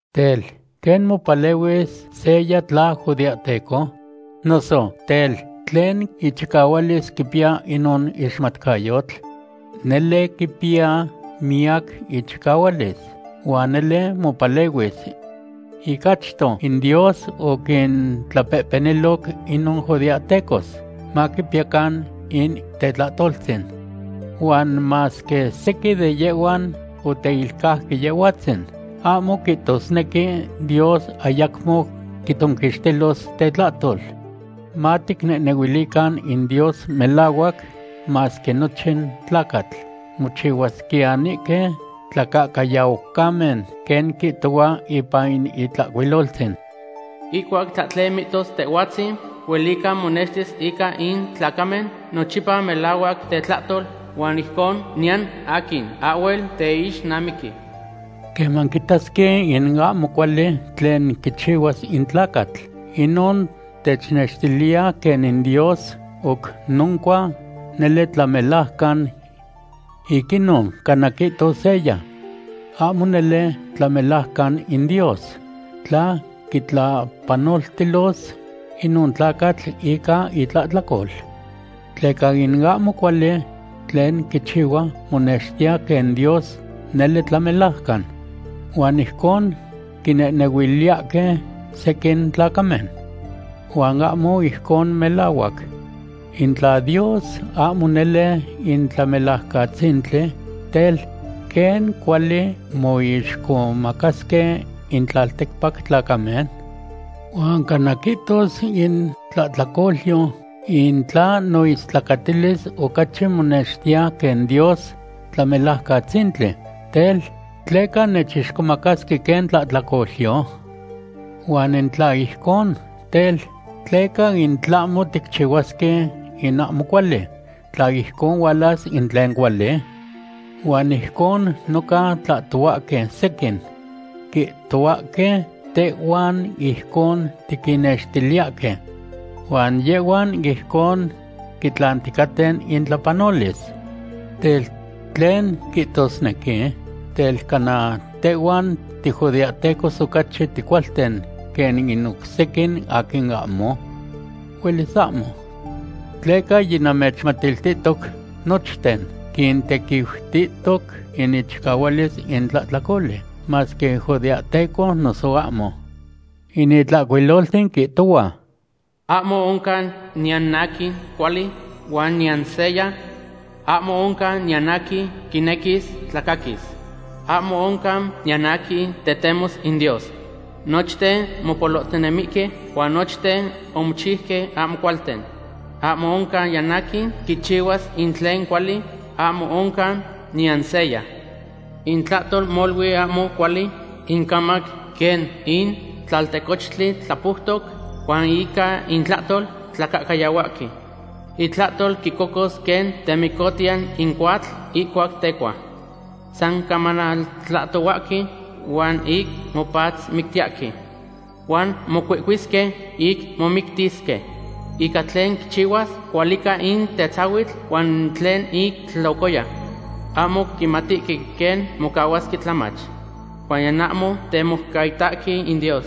Tel, ¿quen mopalehuis seya tla judeahteco? Noso, tel, ¿tlen ichicahualis quipiya inon ixmatcayotl? Nele quipiya miyac ichicahualis, huan nele mopalehuis. Ic achto in Dios oquintlapehpeniloc inon judeahtecos maquipiyacan in tetlahtoltzin. Huan masque sequin de yehhuan oteilcauque Yehhuatzin, ahmo quihtosnequi Dios ayacmo quitzonquixtilos tetlahtol. Maticnehnehuilican in Dios melahuac masque nochin tlacatl mochihuasquiyanihque tlacahcayaucamen. Quen quihtohua ipan in Itlahcuiloltzin: Ihcuac tlahtlen mihtos Tehhuatzin, huelica monextis ica in tlacamen nochipa melahuac tetlahtol, huan ijcon niyan aquin ahhuel teixnamiqui. Queman tiquitasque in ahmo cuali tlen quichihuas in tlacatl, inon technextiliya quen in Dios oc noncua nele tlamelajcan. Ic inon, cana quihtos seya: “Ahmo nele tlamelajcan in Dios tla quitlapanoltilos inon tlacatl ica itlahtlacol, tleca in ahmo cuali tlen quichihua monextiya quen Dios nele tlamelajcan.” Huan ijcon quinehnehuiliyahque sequin tlacamen. ¡Huan ahmo ijcon melahuac! In tla Dios ahmo nele in Tlamelajcatzintli, tel, ¿quen cuali moixcomacasque in tlalticpac tlacamen? Huan cana quihtos in tlahtlacolyo: “In tla noistlacatilis ocachi monextiya quen Dios Tlamelajcatzintli, tel, ¿tleca nechixcomacasque quen tlahtlacolyo?” Huan in tla ijcon, tel, ¿tleca in tlahmo ticchihuasque in ahmo cuali, tla ijcon hualas in tlen cuali? Huan ijcon noca tlahtohuahque sequin. Quihtohuahque tehhuan ijcon tiquinnextiliyahque. Huan yehhuan ijcon quitlanticaten intlapanolis. Tel, ¿tlen quihtosnequi? Tel, ¿cana tehhuan tijudeahtecos ocachi ticualten quen in oc sequin aquin ahmo? Huelis ahmo. Tleca yinamechmatiltihtoc nochten quintequiutihtoc in ichicahualis in tlahtlacoli, masque judeahtecos noso ahmo. In Itlahcuiloltzin quihtohua: Ahmo oncan niyan aquin cuali, huan niyan seya. Ahmo oncan niyan aquin quinequis tlacaquis. Ahmo oncan niyan aquin tetemos in Dios. Nochten mopolohtinemihque huan nochten omochiuque ahmo cualten. Ahmo oncan niyan aquin quichihuas in tlen cuali, ahmo oncan niyan seya. Intlahtol molui ahmo cuali, incamac quen in tlaltecochtli tlapoutoc, huan ica intlahtol tlacahcayahuahque. Intlahtol quicocos quen temicotiya in cohuatl ihcuac tecua. San camanaltlahtohuahque huan ic mopatzmictiyahque. Huan mocuihcuisque ic momictisque. Ica tlen quichihuas, cualica in tetzahuitl huan tlen ic tlocoya. Ahmo quimatihque quen mocahuasque tlamach. Huan niyan ahmo temoucaitahque in Dios.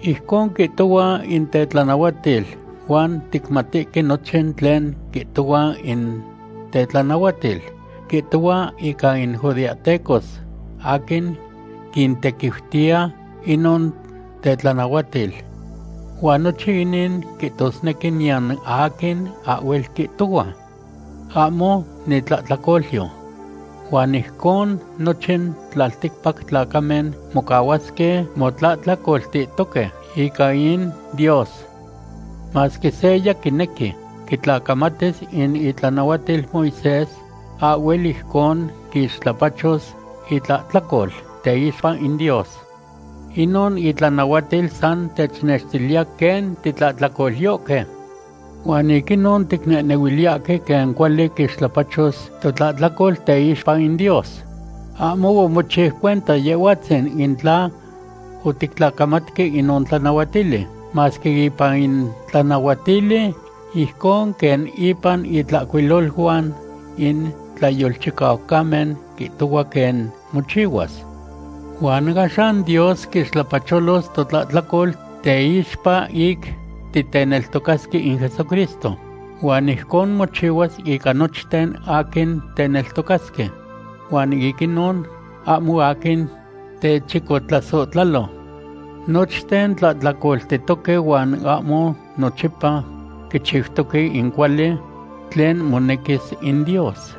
Ijcon quihtohua in tetlanahuatil huan ticmatihque nochin tlen quihtohua in tetlanahuatil, quihtohua ica in judeahtecos aquin quintequiutiya inon tetlanahuatil. Huan nochin inin quihtosnequi niyan aquin ahhuel quihtohua: “Ahmo nitlahtlacolyo.” Huan ijcon nochin tlalticpac tlacamen mocahuasque motlahtlacoltihtohque ica in Dios. Masque seya quinequi quitlacamatis in itlanahuatil Moisés, ahhuel ijcon quixtlapachos itlahtlacol teixpa in Dios. Inon itlanahuatil san technextiliya quen titlahtlacolyohque. Huan ic inon ticnehnehuiliyahque quen cuali quixtlapachos totlahtlacol teixpa in Dios. Ahmo omochiu cuenta Yehhuatzin in tla otictlacamatque inon tlanahuatili, masque ipan in tlanahuatili, ijcon quen ipan intlacuiloluan in tlayolchicaucamen, quihtohua quen mochihuas. Huan axan Dios quixtlapacholos totlahtlacol teixpa ic titeneltocasque in Jesucristo, huan ijcon mochihuas ica nochten aquin teneltocasque. Huan ic inon ahmo aquin techicotlasohtlalo. Nochten tlahtlacoltihtoque huan ahmo nochipa quichiutoque in cuali tlen monequis in Dios.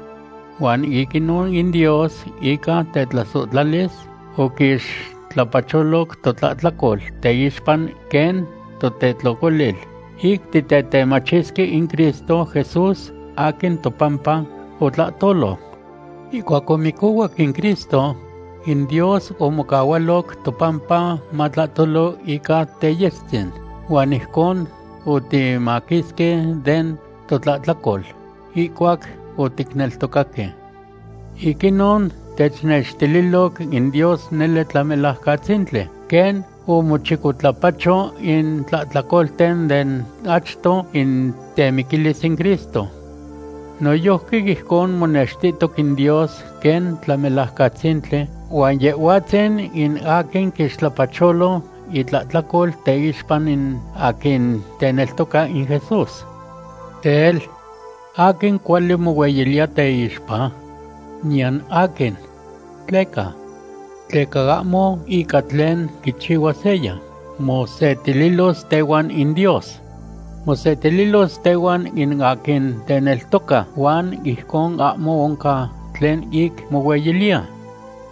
Huan ic inon in Dios ica tetlasohtlalis oquixtlapacholoc totlahtlacol teixpa quen totetlocolil, ic titetemachisque in Cristo Jesús aquin topampa otlahtolo. Ihcuac omicohuac in Cristo, in Dios omocahualoc topampa matlahtolo ica teyestzin, huan ijcon otimaquisque den totlahtlacol ihcuac oticneltocaque. Ic inon technextililoc in Dios nele Tlamelajcatzintli, quen omochicotlapacho in tlahtlacolten den achto in temiquilis in Cristo. Noyojqui ijcon monextihtoc in Dios quen Tlamelajcatzintli huan Yehhuatzin in aquin quixtlapacholo itlahtlacol teixpa in aquin teneltoca in Jesús. Tel, ¿aquin cuali mohueyiliya teixpa? ¡Niyan aquin! ¿Tleca? Tleca ahmo ica tlen quichihuas seya, mosetililos tehuan in Dios. Mosetililos tehuan in aquin teneltoca, huan ijcon ahmo oncan tlen ic mohueyiliya.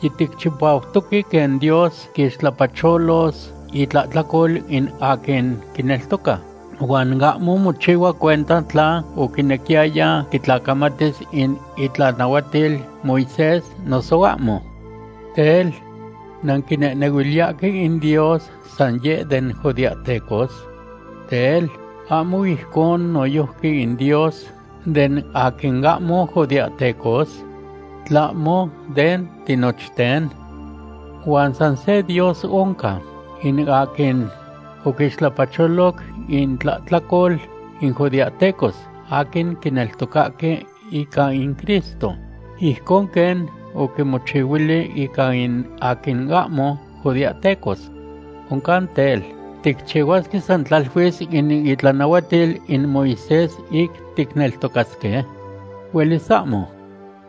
Yiticchipautoque quen Dios quixtlapacholos itlahtlacol in aquin quineltoca, huan ahmo mochihua cuenta tla oquinequiyaya quitlacamatis in itlanahuatil Moisés noso ahmo. Tel, ¿nanquinehnehuiliyahque in Dios san yeh den judeahtecos? Tel, ¿ahmo ijcon noyojqui in Dios den aquin ahmo judeahtecos? ¿Tlahmo den tinochten? Huan san se Dios oncan, in aquin oquixtlapacholoc intlahtlacol in judeahtecos aquin quineltocahque ica in Cristo, ijcon quen oquimochihuili ica in aquin ahmo judeahtecos. Oncan tel, ¿ticchihuasque san tlaluis in itlanahuatil in Moisés ic ticneltocasque? ¡Huelis ahmo!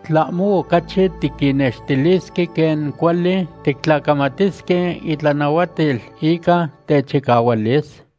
¿Tlahmo ocachi tiquinnextilisque quen cuali tictlacamatisque itlanahuatil ica techicahualis?